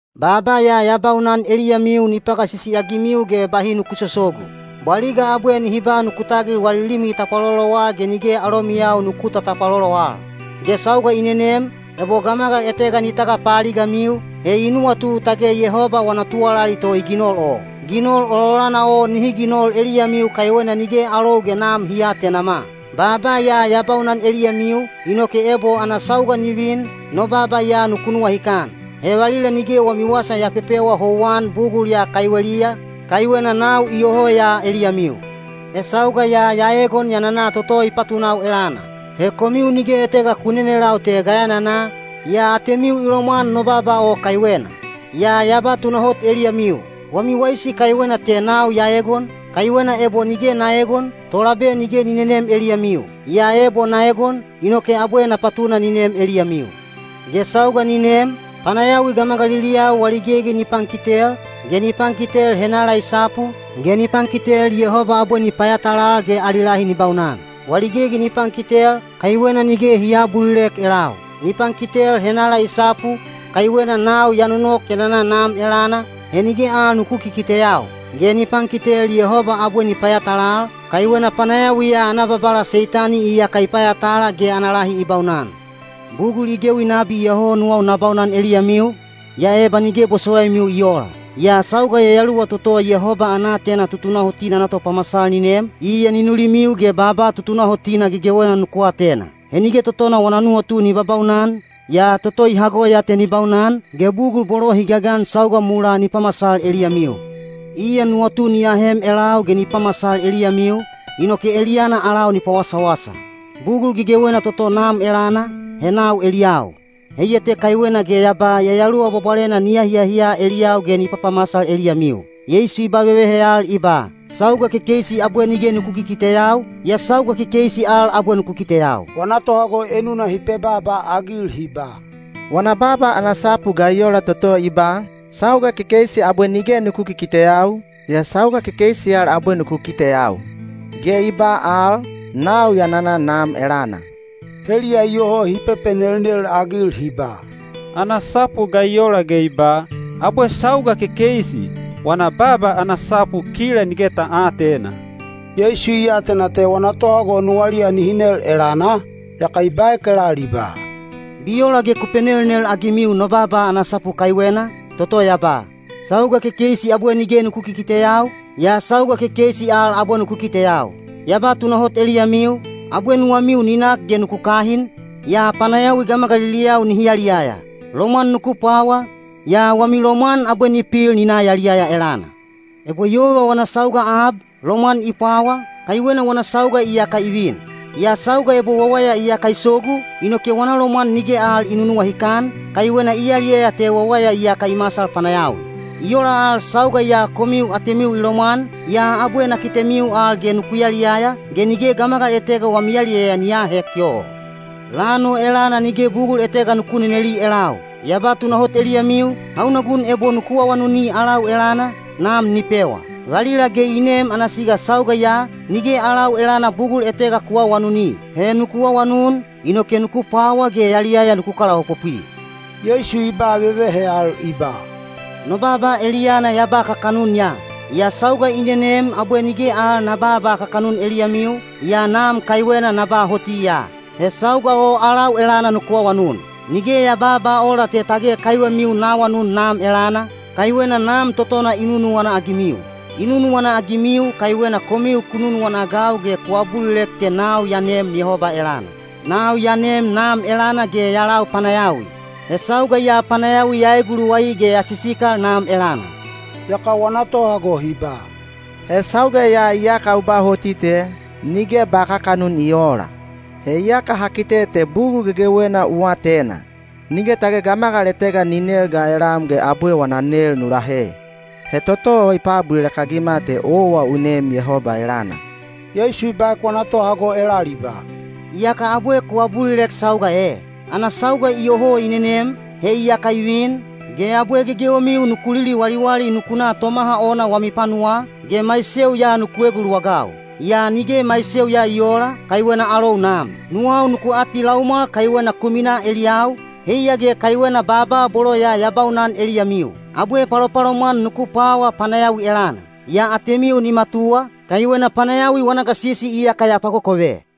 “Baaba ya ya baunan eliyamiu ni pagasisi-agimiu ge bahi nuku sosogu. Bwaliga abwe nihi ba nuku tagil wali limi tapwalolowa ge nige alomiyau nuku tatapwalolo al. Ge sauga i nenem, ebo gamagal etega ni tagapaaligamiu, he i nuwatu tage Yehoba wana tuwalali to i ginol o. Ginol ololana o nihi ginol eliyamiu kaiwena nige alou ge Nam hi aatenama. Baaba ya ya baunan eliyamiu, inoke ebo ana sauga ni vin, no baaba ya nuku nuwahikan. He valila nige wami wasa ya pepewa houwan bugul ya kaiweliya, kaiwena nau iyoho ya eliyamiu.” “He sauga ya ya eegon ya nana toto i patunau elana. He komiu nige etega ku nenelau te ga ya nana, yaa atemiu i lomwan no baaba o kaiwena. Yaa ya ba tunahot eliyamiu: wami waisi kaiwena te nau ya eegon, kaiwena ebo nige na eegon, Tolabe nige ni nenem eliyamiu. Yaa ebo na egon, inoke abwe na patuna ni nem eliyamiu. Ge sauga ni nem, panayawi gamagaliliyau wali gegi ni pankitel, ge ni pankitel henala i sapu, ge ni pankitel Yehoba abwe ni payatalal ge ali lahi ni baunan. Wali gegi ni pankitel, kaiwena nige hi aabulilek elau. Ni pankitel henala i sapu, kaiwena nau ya nonok ya nana Nam elana, he nige al nuku kikiteyau. Ge ni pankitel Yehoba abwe ni payatalal, kaiwena panayawi ya ana babala Seitani iyaka i payatala ge ana lahi i baunan. “Bugul i gewi nabi iyoho nuwau na baunan eliyamiu, yaa eba nige bosowaimiu i oola. Yaa sauga Yayaluwa toto Yehoba ana aatena tutunahotina ana topamasal ni nem, iya ni nulimiu ge baaba tutunahotina gegewena nuku atena. He nige totona wana nuwatu ni babaunan, yaa toto i hago ya te ni baunan, ge bugul bolo hi gagan sauga mulaa ni pamasal eliyamiu. Iya nuwatu ni ahem elau ge ni pamasal eliyamiu, inoke eliyana alau ni pawasawasa. Bugul gegewena toto Nam elana, he nau eliyau. Heiya te kaiwena ge ya ba Yayaluwa Bwabwalena ni ahiahiya eliyau ge ni papamasal eliyamiu.” Yeisu i ba vevehe al i ba, “Sauga kekeisi abwe nige nuku kikiteyau, yaa sauga kekeisi al abwe nuku kiteyau.” Wana tohago enuna hi pebaaba-agil hi ba, “Wana baaba ana sapu ga i ola toto i ba, ‘Sauga kekeisi abwe nige nuku kikiteyau, yaa sauga kekeisi al abwe nuku kiteyau’? Ge i ba al, ‘Nau ya nana Nam elana.’” Heliya iyoho hi pepenelnel-agil hi ba, “Ana sapu ga i ola ge i ba, ‘Abwe sauga kekeisi’? Wana baaba ana sapu kila nige ta aatena.” Yeisu i atena te wana tohago nuwaliya nihi nel elana, yaka i baek elal i ba, “Bi ola ge ku penelnel-agimiu no baaba ana sapu kaiwena, toto ya ba, ‘Sauga kekeisi abwe nige nuku kikiteyau, yaa sauga kekeisi al abwe nuku kiteyau’? Ya ba tunahot eliyamiu, abwe nuwamiu ni nak ge nuku kahin, yaa panayawi gamagaliliyau nihi yaliyaya. Lomwan nuku pwawa, yaa wami lomwan abwe ni pil ni na yaliyaya elana. Ebo yova wana sauga ab, lomwan i pwawa, kaiwena wana sauga iyaka i vin. Yaa sauga ebo wawaya iyaka i sogu, inoke wana lomwan nige al i nunuwahikan, kaiwena i yaliyaya te wawaya iyaka i masal panayawi. I ola al sauga ya komiu atemiu i lomwan, yaa abwe na kitemiu al ge nuku yaliyaya, ge nige gamagal etega wami yaliyaya ni aahek yoho. Lan o elana nige bugul etega nuku neneli elau. Ya ba tunahot eliyamiu, hauna gun ebo nuku awanuni alau elana, Nam ni pewa. Valila ge i nem ana siga sauga ya, nige alau elana bugul etega ku aawanuni. He nuku awanun, inoke nuku pwawa ge yaliyaya nuku kalaopopwi.” Yeisu i ba vevehe al i ba, “No baaba eliyana ya ba kakanun ya. Yaa sauga i nenem abwe nige al na babaa kakanun eliyamiu, yaa Nam kaiwena na ba hoti ya. He sauga o alau elana nuku awanun. Nige ya babaa ola te tage kaiwemiu na awanun Nam elana, kaiwena Nam totona i nunuwana-agimiu. I nunuwana-agimiu kaiwena komiu ku nunuwana-agau ge ku abulilek te nau ya neem Yehoba elana. Nau ya neem Nam elana ge ya lau panayawi; he sauga ya panayawi ya eeguluwai ge ya sisikal Nam elana.” Yaka wana tohago hi ba, “He sauga ya iyaka u ba hoti te, nige ba kakanun i oola. He iyaka ha kite te bugul gegewena u atena. Nige tage gamagal etega ni nel ga eliyam ge abwe wana nel nu lahe. He toto o i paabulilek-agima te owa u neem Yehoba elana.” Yeisu i baek wana tohago elal i ba, “Iyaka abwe ku abulilek sauga e? Ana sauga iyoho i nenem, he iyaka i vin, ge abwe gegewemiu nuku liliwaliwali nuku na tomaha ona wami panuwaa, ge maiseu ya nuku eguluwagau. Yaa nige maiseu ya i oola, kaiwena alou Nam. “Nuwau nuku atilaumwal kaiwena ku minaa eliyau, heiya ge kaiwena baaba bolo ya ya baunan eliyamiu. Abwe palopalomwan nuku pwawa panayawi elana. Yaa atemiu ni matuwa, kaiwena panayawi wana gasisi iyaka ya pakokove.”